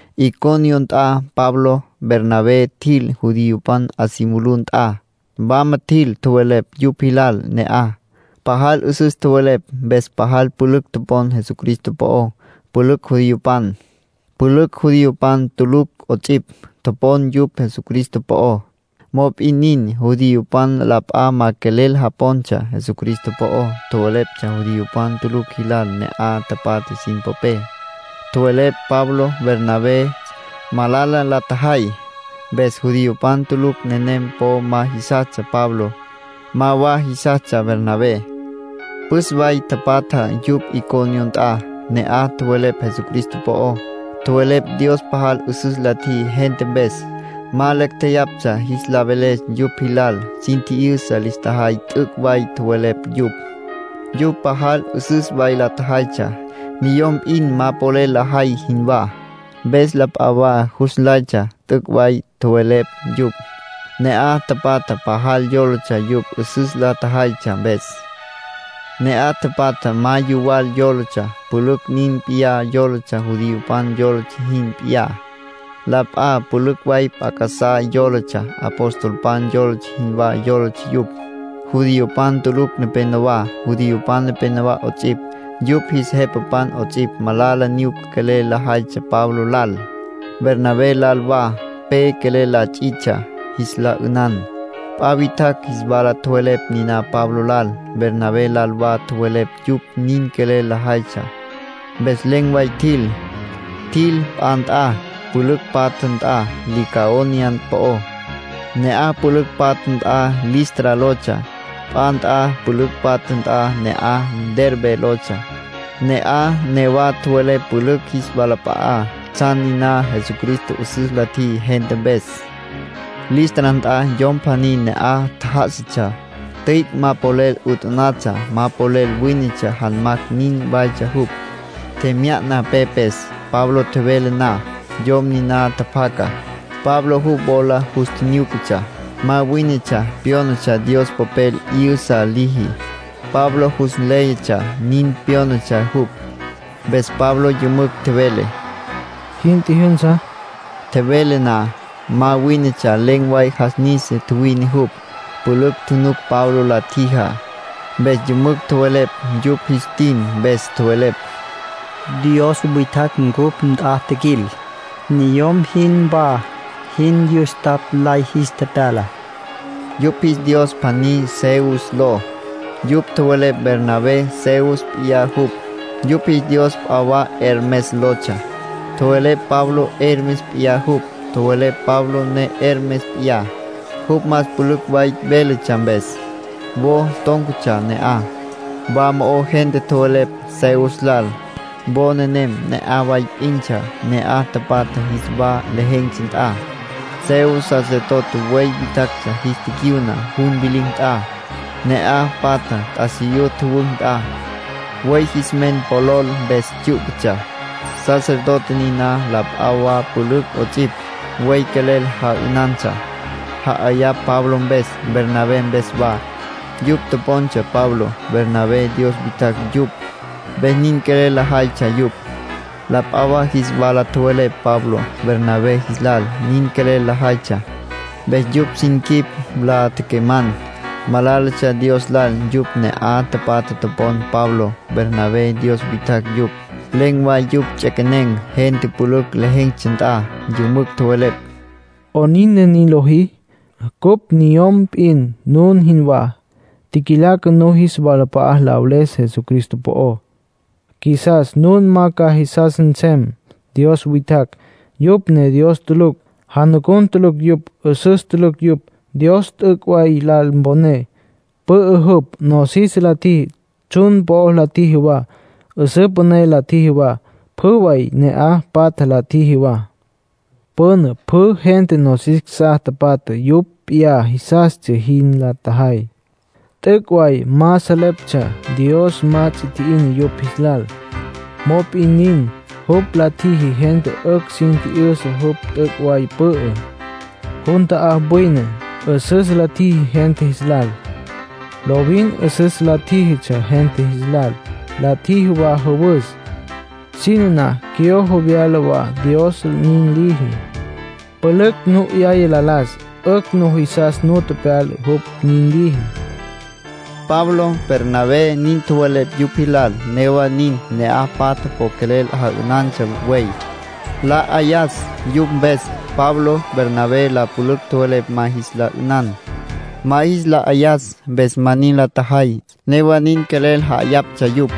Iconio nt'a Pablo, Bernabé, tjil judiopan 'a si mulú nt'a. Wama tjil, tjowelepj yupj jilal ne'aj. Pajal 'üsüs tjowelepj, mpes pajal pülücj topon Jesucristo po'ó. Pülücj judiopan, pülücj judiopan tulucj 'ots'ipj, topon yupj Jesucristo po'ó. Mop'in nin, judiopan la p'a ma quelel japontsja Jesucristo po'ó. Tjowelepj judiopan tulucj jilal ne'aj tapatja sin popé. Tjowelepj Pablo, Bernabé, malala la tjajay. Mpes judiopan tulucj nenem po ma jisastsja Pablo, ma wa jisastsja Bernabé. Püs way tapatja yupj Iconio nt'a. Ne'aj tjowelepj Jesucristo po'ó. Tjowelepj Dios pajal 'üsüs la tjiji gente mpes. Ma lacj jeyaptsja jis la veles yupj jilal. Sin tji'yüsa lis tjajay t'üc' way tjowelepj yupj. Yupj pajal 'üsüs way la tjajaytsja, niyom p'in ma polel lajay jinwá, mpes la p'a wa jus nlaytsja t'üc' tjowelepj yupj. Ne'aj tapatja pajal yólatsja yupj 'üsüs la tjajaytsja mpes. Ne'aj tapatja ma yuwal yólatsja. Pülücj nin p'iyá yólatsja judiopan yólatsja jin p'iyá. La p'a pülücj way p'a casá yólatsja. Apostolpan yólatsja jinwá yólatsja yupj. Judiopan tulucj nepenowá, judiopan nepenowá 'ots'ipj, yupj jis jepapan 'ots'ipj, malala nyuca quelel lajaytsja Pablo lal, Bernabé lal wa. Pe quelel la ts'itsja, jis la 'ünan. P'a witjacj jis wala tjowelepj niná Pablo lal, Bernabé lal wa tjowelepj yupj nin quelel lajaytsja. Mpes len̈ way tjil. Tjil p'a nt'a pülücj patja nt'a Licaonia po'ó. Ne'aj pülücj patja nt'a Listra lotsja. P'a nt'a pülücj patja nt'a ne'aj Derbe lotsja. Ne'aj newa tjowelepj pülücj jis walap'a'á tsjan niná Jesucristo 'üsüs la tjiji gente mpes. Listra nt'a yom pjaní ne'aj tjá'asatsja, tüic' ma polel 'utanatsja, ma polel wínetsja. Janmacj nin waytsja jupj, tjemya'na pepes. Pablo tjevele na, yom niná tjapjaca. Pablo jupj wola jus tjinyúcatsja. Ma wínetsja pyónatsja Dios polel 'yü'sa liji. Pablo jus nléyatsja nin pyónatsja jupj. Mpes Pablo yümücj tjevele: —Jin tjijyünsa. Tjevele na, ma wínetsja len̈ way jas nisa, tjuwine jupj. Pülücj tjunuc Pablo la tjijá. Mpes yümücj tjowelepj, yupj jis tin mpes. Tjowelepj: —Dios witjacj cupj nt'a tjiquil. Niyom jinwá jin yustapj lay jis tepyala —nin tjowelepj. Yupj jis dios pjaní Zeus ló. Yupj tjowelepj Bernabé Zeus p'iyá jupj. Yupj jis dios p'a wa Hermes lotsja. Tjowelepj Pablo Hermes p'iyá jupj. Tjowelepj Pablo ne Hermes p'iyá, jupj más pülücj way véletsja mpes. Wo tón̈catsja ne'aj, wa mo'o gente tjowelepj Zeus lal. Wo nenem ne'aj way p'intsja ne'aj tapatja jis wa lejen̈tsja nt'a. Zeus sacerdote buey witjacj jis ticyuna jun vilicj nt'a, ne'aj patja t'asiyú tjüwücj nt'a. Buey jis men polol mpes tsyú'patsja. Sacerdote niná, la p'a wa pülücj 'ots'ipj, buey quelel ja'ünantsja, ja'ayapj Pablo mpes, Bernabé mpes wa. Yupj topontsja Pablo, Bernabé dios witjacj yupj, mpes nin quelel lajaytsja yupj. La p'a wa jis wala tjowelepj Pablo, Bernabé jis lal, nin quelel lajaytsja. Mpes yupj sin quip la tequeman̈; malálatsja Dios lal yupj ne'aj tapatja topon Pablo, Bernabé, dios witjacj yupj. Len̈ way yupj ts'equenen̈ gente pülücj lejen̈tsja nt'a, yümücj tjowelepj: —¿'Onin ne nin lojí? Cupj niyom p'in, nun jinwá. Tjiquilaca nun jis walap'a'a la veles Jesucristo po'ó. Qjuisas nun ma ca jisas nsem dios witjacj, yupj ne Dios tulucj. Janucun tulucj yupj, 'üsüs tulucj yupj. Dios t'üc' way lal mponé. Pü'ü jupj. Nosis la tjiji. Tsjun po'ó la tjiji wa. 'Üsǘ püné la tjiji wa. Pjü way ne'aj patja la tjiji wa. Püna pjü gente nosis casá patja yupj p'iyá jisastsja jin la tjajay. T'üc' way ma salejeptsja. Dios ma ts'i tji'ina yupj jis lal. Mop'in nin, jupj la tjiji gente 'ücj sin tji'yüsa jupj t'üc' way pü'ü. Jun ta'á wine. 'Üsüs la tjiji gente jis lal. Lovin 'üsüs la tjíjitsja gente jis lal. La tjiji wa jüwüs. Siná na, cyojo, vyala wa Dios nin liji. Pülücj nu 'yaya la las. 'Ücj nujisas nu pyala jupj nin liji —Pablo, Bernabé, nin tjowelepj yupj jilal. Newa nin, ne'aj patja po quelel ja'ünantsja buey, la 'ayas yupj mpes. Pablo, Bernabé, la pülücj tjowelepj ma jis la 'ünan, ma jis la 'ayas. Mpes ma nin la tjajay; newa nin quelel ja'ayaptsja yupj.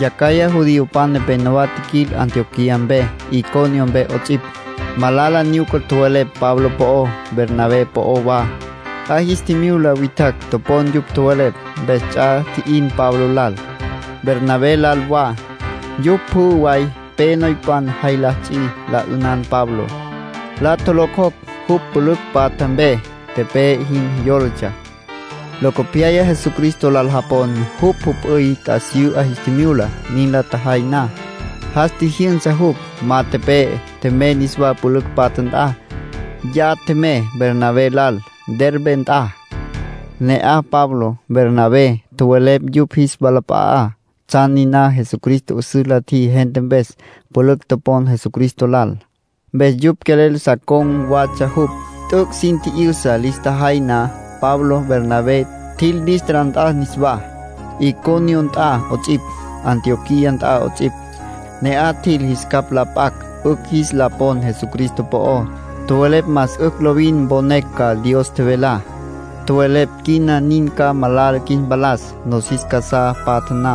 Yacjaya judiopan nepenowá tjiquil Antioquía mpe, Iconio mpe 'ots'ipj. Malala nyuca tjowelepj Pablo po'ó, Bernabé po'ó wa. 'A jis tjimyula witjacj topon yupj tjowelepj, mpes ts'a tji'in Pablo lal, Bernabé lal wa. Yupj pjü way pe noypan jay la ts'i, la 'ünan Pabló. La tjolocjocj jupj pülücj patja mpe. Tepe'e jin yólatsja. Locopyaya Jesucristo lal japon jupj jüp'üy t'asiyú 'a jis tjimyula. Nin la tjajay na, jas tjijyünsa jupj. Ma tepe'e. Tjemey niswá pülücj patja nt'a. Ya tjemey Bernabé lal Derbe nt'a. Ne'aj Pablo, Bernabé, tjowelepj yupj jis walap'a'á tsjan niná Jesucristo 'üsüs la tjiji gente mpes. Pülücj topon Jesucristo lal, mpes yupj quelel sa con̈ watsja jupj. T'üc' sin tji'yüsa lis tjajay na, Pablo, Bernabé, tjil Listra nt'a niswá, Iconio nt'a 'ots'ipj, Antioquía nt'a 'ots'ipj. Ne'aj tjil jis capj la p'acj 'ücj jis la pon Jesucristo po'ó. Tjowelepj más 'ücj lovin mponecj ca Dios tjevelá. Tjowelepj quina nin ca malala qjuis mpalas. Nosis casá patja na,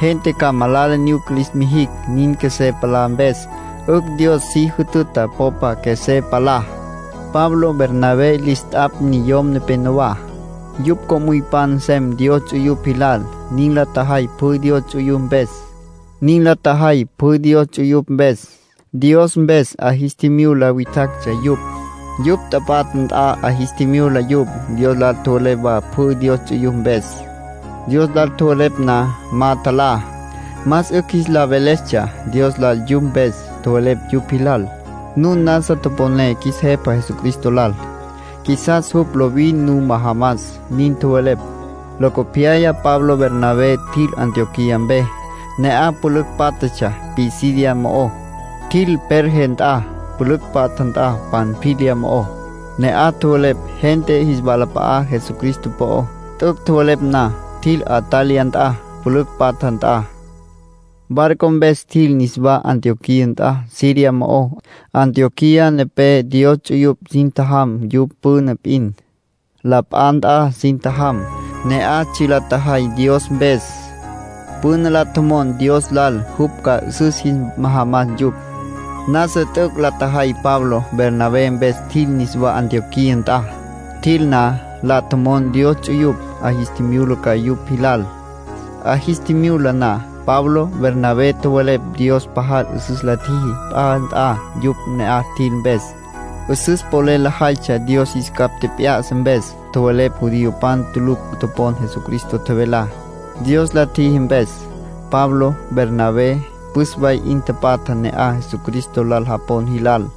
gente ca malala nyuca lis mijicj. Nin qjuesé palá mpes, 'ücj Dios si jütüta popa qjuesé palá. Pablo, Bernabé, lis t'apj niyom nepenowá, yupj co'müypan nsem Dios ts'uyupj jilal. Nin la tjajay pjü Dios ts'uyupj mpes, Dios mpes 'a jis tjimyula witjactsja yupj. Yupj tapatja nt'a 'a jis tjimyula yupj. Dios lal tjowelepj wa pjü Dios ts'uyupj mpes. Dios lal tjowelepj na, ma tjalá, más 'ücj jis la velestsja Dios lal yupj mpes. Tjowelepj yupj jilal: “Nun nasa toponé qjuis Jepa Jesucristo lal. Qjuisas jupj lovin nu majamas”, nin tjowelepj. Locopyaya Pablo, Bernabé, tjil Antioquía mpe, ne'aj pülücj pátjatsja Pisidia mo'ó. Tjil Perge nt'a, pülücj patja nt'a Panfilia mo'ó. Ne'aj tjowelepj gente jis walap'a'á Jesucristo po'ó. T'üc' tjowelepj na, tjil Atalia nt'a, pülücj patja nt'a. Barco mpes tjil niswá Antioquía nt'a Siria mo'ó. Antioquía nepé Dios ts'uyupj sin tjajam yupj püna p'in. La p'a nt'a sin tjajam, ne'aj tsji' la tjajay Dios mpes. Püna la tjomon Dios lal jupj ca 'üsüs jis majamas yupj. Nasa t'üc' la tjajay Pablo, Bernabé, mpes tjil niswá Antioquía nt'a. Tjil na, la tjomon Dios ts'uyupj 'a jis mulus ca yupj jilal. 'A jis tjimyula na, Pablo, Bernabé tjowelepj Dios pajal 'üsüs la tjiji p'a nt'a yupj ne'aj tjil mpes. 'Üsüs polel lajaytsja Dios jis capj tjep'ya'sa mpes. Tjowelepj judiopan tulucj topon Jesucristo tjevelá, Dios la tjiji mpes. Pablo, Bernabé, püs way 'in tapatja ne'aj Jesucristo lal japon jilal.